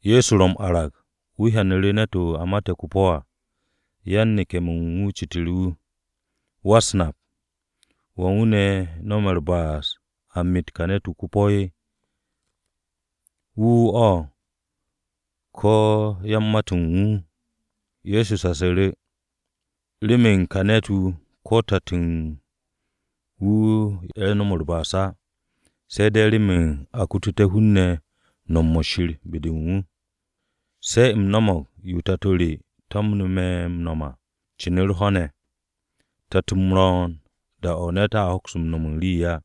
Ye̱so ro m-arag, wu̱ hyanu̱ru̱ ne̱t-wu̱ a mate̱ ko-po̱ à. Yan-neke̱-mo̱ u̱n wu̱ citu̱ru̱ wu̱, “Wa-u̱s-Nap, ¿wan wu̱ ne̱ no̱me̱ u̱r-ba'as a met ka ne̱t-wu̱ ko-po̱? ¿Wu̱ wu̱ o̱? ¿Ko̱ yan-mat-o̱ u̱n wu̱?” Ye̱so shasu̱ru̱, “Remen ka ne̱t-wu̱, ko̱ tato u̱n wu̱ ye̱ no̱m u̱r-ba'as á, se̱ de̱ remen a kututé̱ hun-ne̱ nom-mo̱ Shir be-de u̱n wu̱. Se̱ u̱m no̱mo̱g yo Tato re to̱mne̱ me̱ m-no̱m à, cin u̱r-ho̱ ne̱. Te̱t-m ro̱o̱n, da-o̱ ne̱t a hoks no̱m u̱n rii á.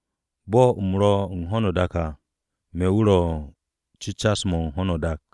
Bo̱ u̱m ro̱ u̱n ho̱no o-dak à, me̱ wu̱ ro̱ cecas-mo̱ u̱n ho̱no o-dak.”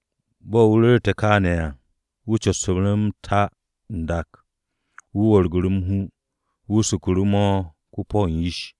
Bo̱ wu̱ ru̱rte̱ kááne̱ à, wu̱ copsu̱ru̱ m-ta n-dak. Wu̱ wu̱rgu̱ru̱ m-hu, wu̱ suku̱ru̱ mo̱ ko-po̱ u̱n yish.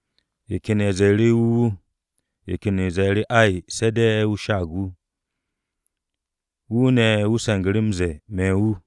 Ye̱ ken ye̱ ze̱e̱ru̱, “Wu̱ wu̱.” Ye̱ ken ye̱ zee, “Ay, se̱ de̱ wu̱ sha'ag wu̱.” Wu̱ ne̱, wu̱ se̱ngu̱ru̱ m-ze̱e̱, “Me̱ wu̱.”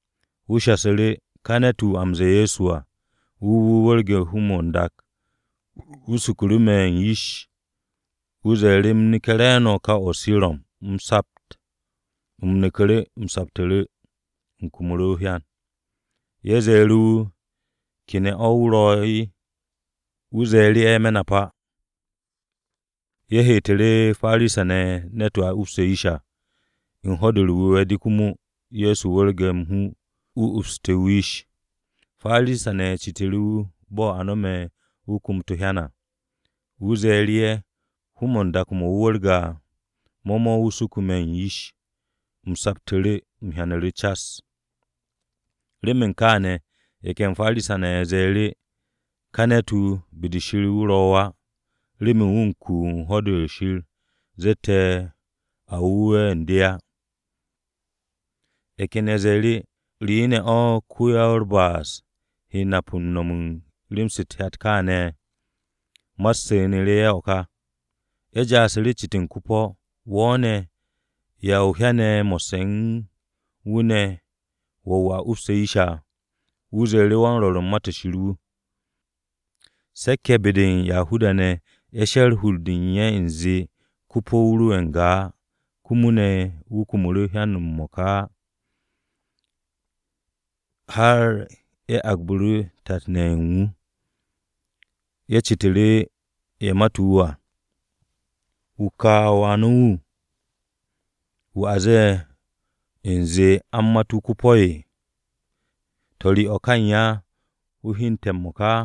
Wu̱ shasu̱ru̱, “Ka ne̱t-wu̱, wu̱ a m-ze̱e̱ Ye̱so à, wu̱ wu̱ wu̱rge̱ hu-mo̱ n-dak, wu̱ suku̱ru̱ me̱ u̱n yish. Wu̱ zee u̱m neke̱ re̱e̱no̱ kaw-o̱ o-Sirom u̱m sapt. U̱m neku̱ru̱, u̱m saptu̱ru̱, u̱m kumu̱ru̱ o-hyan.” Ye̱ ze̱e̱ru̱ wu̱, “¿Ke ne̱ o̱ wu̱ ro̱?” Wu̱ ze̱e̱ru̱ ye̱, “Me̱ nap á.” Ye̱ heetu̱ru̱ Parisa-ne̱ ne̱t-wu̱ a upse̱ yish à. U̱n Ho̱-de u̱r-Wu̱we̱ de komo Ye̱so wu̱rge̱ m-hu, wu̱ upsu̱te̱ wu̱ yish. Parisa-ne̱ citu̱ru̱ wu̱ bo̱ a no̱me̱ wu̱ kumut o-hyan à. Wu̱ ze̱e̱ru̱ ye̱, “Hu-mo̱ n-dak mo̱ wu̱ wu̱rge̱ à, mo̱ mo̱ wu̱ suke̱ me̱ u̱n yish. U̱m saptu̱ru̱, u̱m hyanu̱ru̱ cas.” Remen kááne̱, ye̱ ken Parisa-ne̱ ye̱ ze̱e̱ru̱, “Ka ne̱t-wu̱, be-de Shir o̱ wu̱ ro̱ á, remen wu̱ ku ho̱-de Shir zette̱ a wu̱we̱ u̱n de á.” Ye̱ ken ye̱ ze̱e̱ru̱, “¿Re ne̱ o̱ ko-wa-u̱r-ba'as he nap u̱n no̱m u̱n rem-se u̱t-hyat kááne̱?” Ma-u̱t su̱nu̱tu̱ ye̱ o̱ ka. Ye̱ ja'asu̱ru̱ m-cit u̱n ko-po̱, “Wo̱ ne̱, ¿ya o hyane̱ mo̱sse̱ u̱n wu̱ ne̱ wo̱ wu̱ a upse̱ yish à?” Wu̱ ze̱e̱ru̱, “Wan-rwo̱r u̱n Ma-to̱ Shir wu̱.” Se̱k-ye̱ be-de u̱n Yahuda-ne̱, ye̱ she̱r hur-de u̱n ye̱ u̱nze ko-po̱-wu̱ ro'e̱ n-ga á, komo ne̱ wu̱ kumu̱ru̱ o-hyan m-mo̱ka á, har ye̱ agbu̱ru̱ tat-ne̱ ye̱ u̱n wu̱. Ye̱ citu̱ru̱ ye̱ mate̱ wu̱ à, “¿Wu̱ ka wà no̱ wu̱, wu̱ a zee u̱nze a u̱n mat wu̱ ko-po̱? ¿To̱, re o̱ ka u̱n ya wu̱ hyente̱ m-mo̱ka?”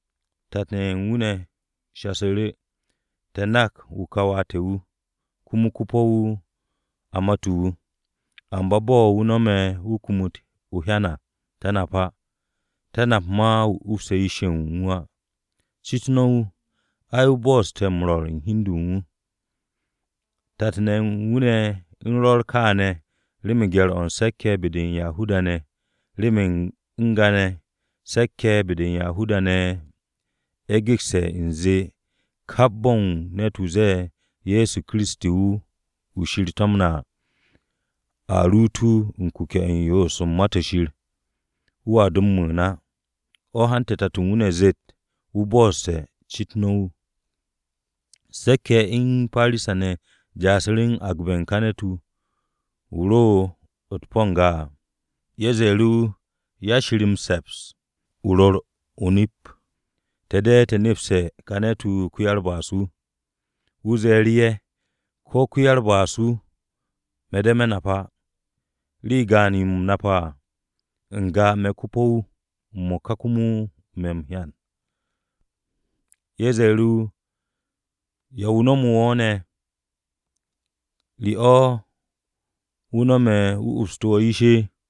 Tat-ne̱ ye̱ u̱n wu̱ shasu̱ru̱, “Te̱ nak wu̱ ka wà te̱ wu̱ komo ko-po̱-wu̱ a mate̱ wu̱. Amba bo̱ a no̱me̱ wu̱ kumut o-hyan à, te̱ nap á. Te̱ nap ma wu̱ upse̱ yish-ye̱ u̱n wu̱ á. Cit no̱ wu̱. Ai, wu̱ bo̱'o̱ssu̱te̱ m-rwo̱r u̱n hi u̱n de u̱n wu̱.” Tat-ne̱ u̱n wu̱ u̱n rwo̱r kaane̱ remen gye̱r-o̱ u̱n Se̱k-ye̱ be-de u̱n Yahuda-ne̱. Remen n-ga ne̱, Se̱k-ye̱ be-de u̱n Yahuda-ne̱ ye̱ gekse̱ u̱nze kap bo̱n ne̱t-wu̱ ze̱e̱, “Ye̱so ro̱ Kiristi wu̱ Shir to̱mne̱ à,” a ruut wu̱ u̱n kuke̱-o̱ u̱n yoos u̱n Ma-to̱ Shir, wu̱a do m-mu̱u̱n á. O̱ hante̱ tato u̱n wu̱ ne̱ zet, “Wu̱ bo̱'o̱ssu̱te̱. Cit no̱ wu̱.” Se̱k-ye̱ u̱n Parisa-ne̱ ja'asu̱ru̱ agbe̱ u̱n ka ne̱t-wu̱ wu̱ ro u̱t-po̱ n-ga à. Ye̱ ze̱e̱ru̱ wu̱, “'Ya Shir m-se̱ps, o ru̱r o-nip. Te̱ de̱ te̱ nepste̱ ka ne̱t-wu̱ ko-ya-u̱r-ba'as-wu̱.” Wu̱ ze̱e̱ru̱ ye̱, “Ko̱ ko-ya-u̱r-ba'as-wu̱, me̱ de̱ me̱ nap á. Rii gaan-yo u̱m nape̱ à, n-ga me̱ ko-po̱-wu̱, m-mo̱ka komo me̱ m-hyan.” Ye̱ ze̱e̱ru̱ wu̱, “¿Ya wu̱ no̱mu̱ wo̱ ne̱? ¿Re o̱ wu̱ no̱me̱ wu̱ upsu̱tu̱ wo̱ yish?”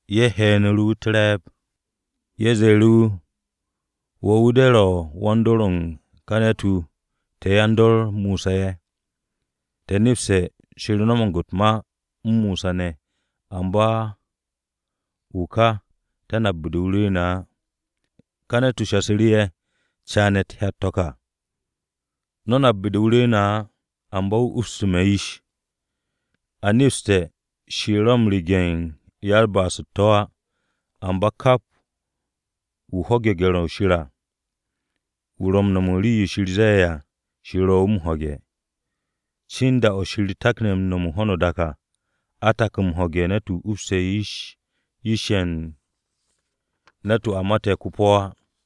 Ye̱ he̱'e̱nu̱ru̱ wu̱ u̱t-re̱e̱b. Ye̱ ro̱ wu̱ m-ze̱e̱, “Wo̱ wu̱ de̱ ro̱ wan-dor-o̱ u̱n ka ne̱t-wu̱, te̱ yan-dor Mosa ye̱. Te̱ nepse̱ Shir no̱mo̱g u̱t-ma u̱n Mosa ne̱, amba wu̱ ka, te̱ nap be-de wu̱ rwu̱u̱ne̱ á.” Ka ne̱t-wu̱ shasu̱ru̱ ye̱, “Caane̱ hyat-to̱ ka! No̱ nap be-de wu̱ rwu̱u̱ne̱ á, amba ne̱ wu̱ upsu̱ssu̱te̱ me̱ yish! A nepste̱, Shir ro̱ u̱n rege̱ u̱n ya-u̱t-ba'as u̱t-to̱ á. Amba kap wu̱ ho̱ge̱ gye̱r-o̱ Shir à, wu̱ ro̱ u̱n no̱m u̱n rii-yo Shir ze̱e̱ à, Shir ro̱ wu̱ m-ho̱ge̱. Cin da-o̱ Shir takne̱ no̱m u̱n ho̱no o-dak à, a tak m-ho̱ge̱ ne̱t-wu̱ upse̱ yish-ye̱ u̱n ne̱t-wu̱ a mate̱ ko-po̱ á.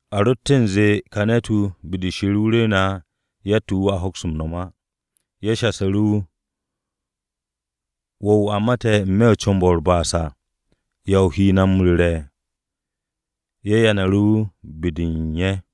A rotte̱ u̱nze ka ne̱t-wu̱, be-de Shir o̱ wu̱ rwu̱u̱ne̱ á, yatt-yo wu̱ roa hoks m-no̱m á.” Ye̱ shasu̱ru̱ wu̱, “Wo̱ wu̱ a mate̱ n-me̱ u̱n comb-o̱ u̱t-ba'as à, ¿yan yo ne̱ o he na m-ru̱re̱?” Ye̱ yanu̱ru̱ wu̱ be-de u̱n ye̱.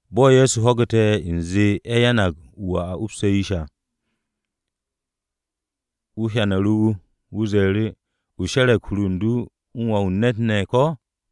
Bo̱ Ye̱so ho̱gu̱te̱ u̱nze ye̱ yanag ka wu̱ a upse̱ yish à, wu̱ hyanu̱ru̱ wu̱. Wu̱ ze̱e̱ru̱, “¿O she̱re̱g hur u̱n du u̱n Wà-wu̱ u̱n ne̱t ko̱?”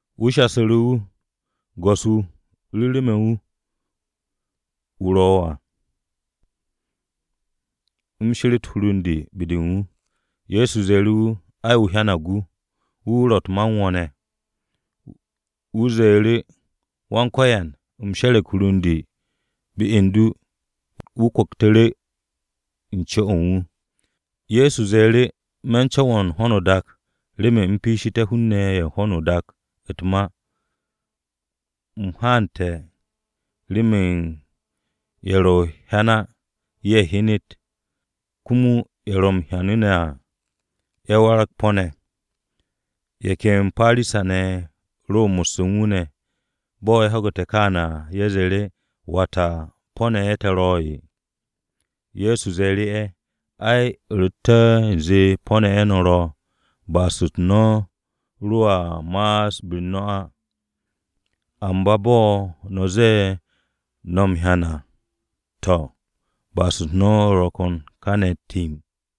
Wu̱ shasu̱ru̱ wu̱, “Go̱s-wu̱, ru̱ru̱ me̱ wu̱, wu̱ ro̱ à, u̱m she̱re̱t hur u̱n de be-de u̱n wu̱.” Ye̱so ze̱e̱ru̱ wu̱, “Ai, o hyanag wu̱. Wu̱ wu̱ ro̱ u̱t-ma u̱n wo̱ ne̱.” Wu̱ ze̱e̱ru̱, “Wan-Ko̱yan, u̱m she̱re̱g hur u̱n de be-de u̱n du.” Wu̱ kwu̱ktu̱ru̱ u̱n co-o̱ u̱n wu̱. Ye̱so ze̱e̱ru̱, “Me̱ u̱n co̱wo̱n u̱n ho̱no o-dak, remen u̱m piishté̱ hun-ne̱ ye̱ u̱n ho̱no o-dak u̱t-ma. U̱m haante̱ remen ye̱ ro̱ m-hyan á, ye̱ hyenet, komo ye̱ ro̱ m-hyanu̱ ne̱ à, ye̱ waragté̱ po̱-ne̱.” Ye̱ ken Parisa-ne̱ ye̱ ro mo̱sse̱ u̱n wu̱ ne̱. Bo̱ ye̱ ho̱gu̱te̱ kááne̱ à, ye̱ ze̱e̱ru̱, “¿Wata po̱-ne̱ ye̱ te̱ ro̱'e̱?” Ye̱so ze̱e̱ru̱ ye̱, “Ai, u̱ rotte̱ u̱nze po̱-ne̱ ye̱ no̱ ro̱, ba'as-u̱t no̱ roa ma'as be-u̱r no̱ á. Amba bo̱ no̱ ze̱e̱ no̱ m-hyan à to̱, ba'as-u̱t no̱ ro̱ kane̱ timb.”